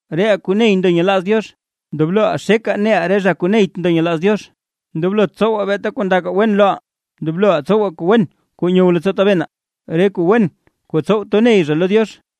Reʼaa kuu ney ndo nyelaaz Diox, ndobloʼaa xekaa neʼaa re zha kuu neyt ndo nyelaaz Diox; ndoblot tsowaa beeta kuu ndakaa wen loʼaa. Ndobloʼaa tsowaa kuu wen kuu nyow leettsoo tabenaa, re kuu wen kuu tsow to ney zha lo Diox.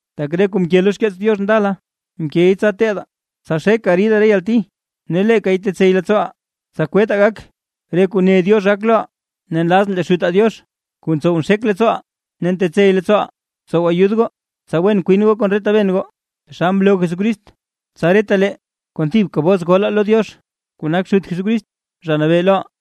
Tak re kuu mke lo xkeets Diox ndala, mkey tsa teedaa; tsa xekaa ridaa re yalti, ne leekay tetsey leettsooʼaa, tsa kwettaa gak re kuu ne Diox gak loʼaa. Ne nlazʼn lee Xutaa Diox kuu ntsow nxek leettsooʼaa ne ntetsey leettsooʼaa tsow ayud goo, tsa wen kwin goo kon re taben goo, taxal mloo Jesucrist, tsa retalee kon thibka bos golaa lo Diox kuu nak Xut Jesucrist, Zha Nabee loʼaa.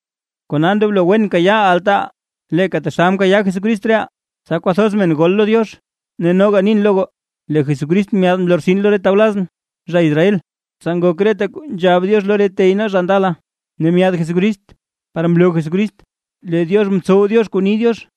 Kona ndoblo wen kayaaʼaa altaaʼaa, leeka taxal mkayaa Jesucrist reʼaa, tsa kwathoz men gol lo Diox. Ne noga nin lo goo, lee Jesucrist myaad mlortsin lo re tawlazʼn, zha Israel, tsa ngok reta kuu nzhab Diox lo re tey nee zha ndala, ne myaad Jesucrist par mloo Jesucrist lee Diox ntsow Diox kuu ni Diox.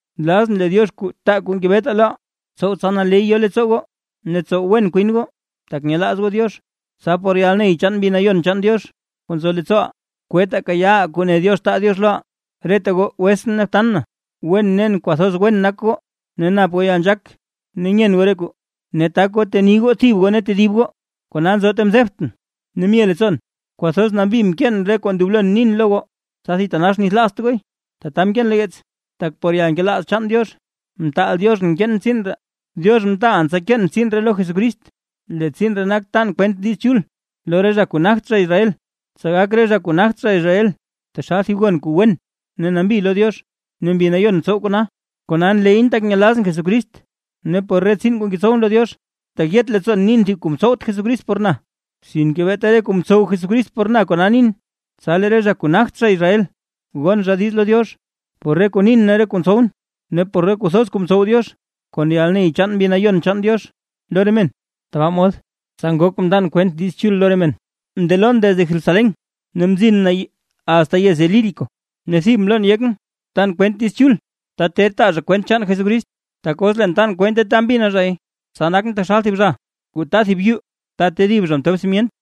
Nlazʼn lee Diox kuu taa kuu ngebetaa loʼaa, tsow tsa naley yo leettsoo goo ne tsow wen kwin goo, tak nyelaaz goo Diox, tsa por yalney chaan Mbi Nayon chaan Diox kuu nzo leettsooʼaa, kwettaa kayaaʼaa kuu ne Diox taa Diox loʼaa. Reta goo wetsʼn ne btan na, wen nen kwathoz wen nak goo, ne nap goo yalnzhaak nyen goo re kuu, ne tak goo teni goo thib goo ne tedib goo. Kona nzo ta mzebtʼn ne mye leettsoon kwathoz nambi mkeen re kuu ndoblo nin lo goo, tsa thitanax nithlaazt gooy; tata mkeen lo yeets, tak por yalnkelaaz chaan Diox mtaal Dioxʼn keen tsiin ree. Dioxʼn mtaalʼn tsa keen tsiin lo Jesucrist, lee tsiin ree nak tan kwent Diiz Chul lo re zha kuu nagt zha Israel. Tsa gak re zha kuu nagt zha Israel taxal thib gon kuu wen ne nambi lo Diox, ne Mbi Nayon ntsow kona. Kona nleyʼn tak nyelazʼn Jesucrist ne por re tsiin kuu ngetsowʼn lo Diox. Tak yet leettsoon nin thib kuu mtsowt Jesucrist por na, sinke beeta re kuu mtsow Jesucrist por na kona nin, tsa lee re zha kuu nagt zha Israel gon zha diiz lo Diox, por re kuu nin ne por re kuu ntsowʼn. Ne por re kuu thoz kuu mtsow Diox kon yalney chaan Mbi Nayon chaan Diox lo re men. Tbaa mod tsa ngok mndan kwent Diiz Chul lo re men, mndelon desde Jerusalén ne mzin na asta yez Ilírico. Ne thib mlon yekʼn tan kwent Diiz Chul, ta ter taa zha kwent chaan Jesucrist. Tak os leen tan kwente ta mbina zhay, tsa nakʼn taxal thib zha kuu taa thib yuu ta tedib zha mtob simyent,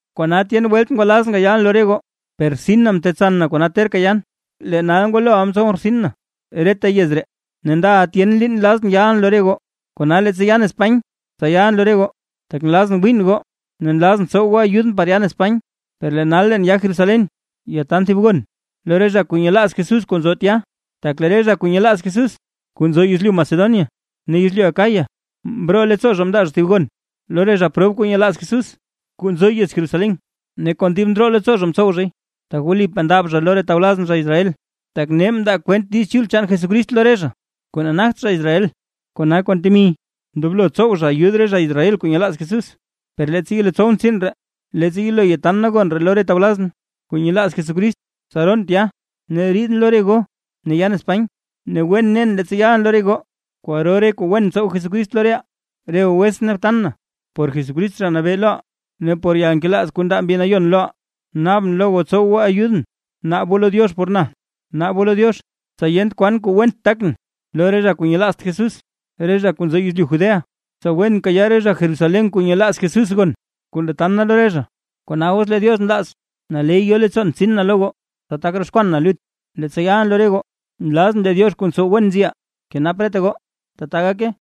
Kona tyen welt ngwalazʼn gayalʼn lo re goo, per rtsin na mtetsan na kona terka yan. Lee nal ngwaloʼa mtsowʼn rtsin na reta yez ree; ne ndaʼa tyen liin nlazʼn yalʼn lo re goo, kona leettsa yan Espany, tsa yalʼn lo re goo, tak nlazʼn wiin goo ne nlazʼn tsow goo ayudʼn par yan Espany. Per lee nal leen ya Jerusalén yataan thib gon lo re zha kuu nyelaaz Jesús kuu nzo tya, tak lee re zha kuu nyelaaz Jesús kuu nzo yezlyu Macedonia ne yezlyu Acaya, mroo leettsoo zha mndaa zha thib gon lo re zha prob kuu nyelaaz Jesús, kuu nzo yez Jerusalén. Ne kon dib ndroo leettsoo zha mtsow zhay, tak wlipaa ndab zha lo re tawlazʼn zha Israel, tak nee mndaa kwent Diiz Chul chaan Jesucrist lo re zha kuu nagt zha Israel, kona kon temi, ndoblo tsow zha ayud re zha Israel kuu nyelaaz Jesucrist. Per leettsa yelo tsowʼn tsiin ree, leettsa yelo yatan na gon ree lo re tawlazʼn kuu nyelaaz Jesucrist; tsa roon tya ne riidʼn lo re goo ne yan Espany. Ne wen nen leettsa yalʼn lo re goo, kwaro re kuu wen tsow Jesucrist lo reʼaa. Re goo wetsʼn ne btan na, por Jesucrist Zha Nabee loʼaa, ne por yalnkelaaz kuu ndaa Mbi Nayon loʼaa, naabʼn lo goo tsow goo ayudʼn naab goo lo Diox por na. Naab goo lo Diox tsa yent kwan kuu went takʼn lo re zha kuu nyelaazt Jesús, re zha kuu nzo yezlyu Judea, tsa wen kayaa re zha Jerusalén kuu nyelaaz Jesús gon kuu ndatan na lo re zha. Kona os lee Diox nlaaz, naley yo leettsoon tsin na lo goo, tsa tak roxkwan na lut leettsa yalʼn lo re goo. Nlazʼn lee Diox kuu ntsow wen nziʼaa, kenap reta goo. ¡Tata gake!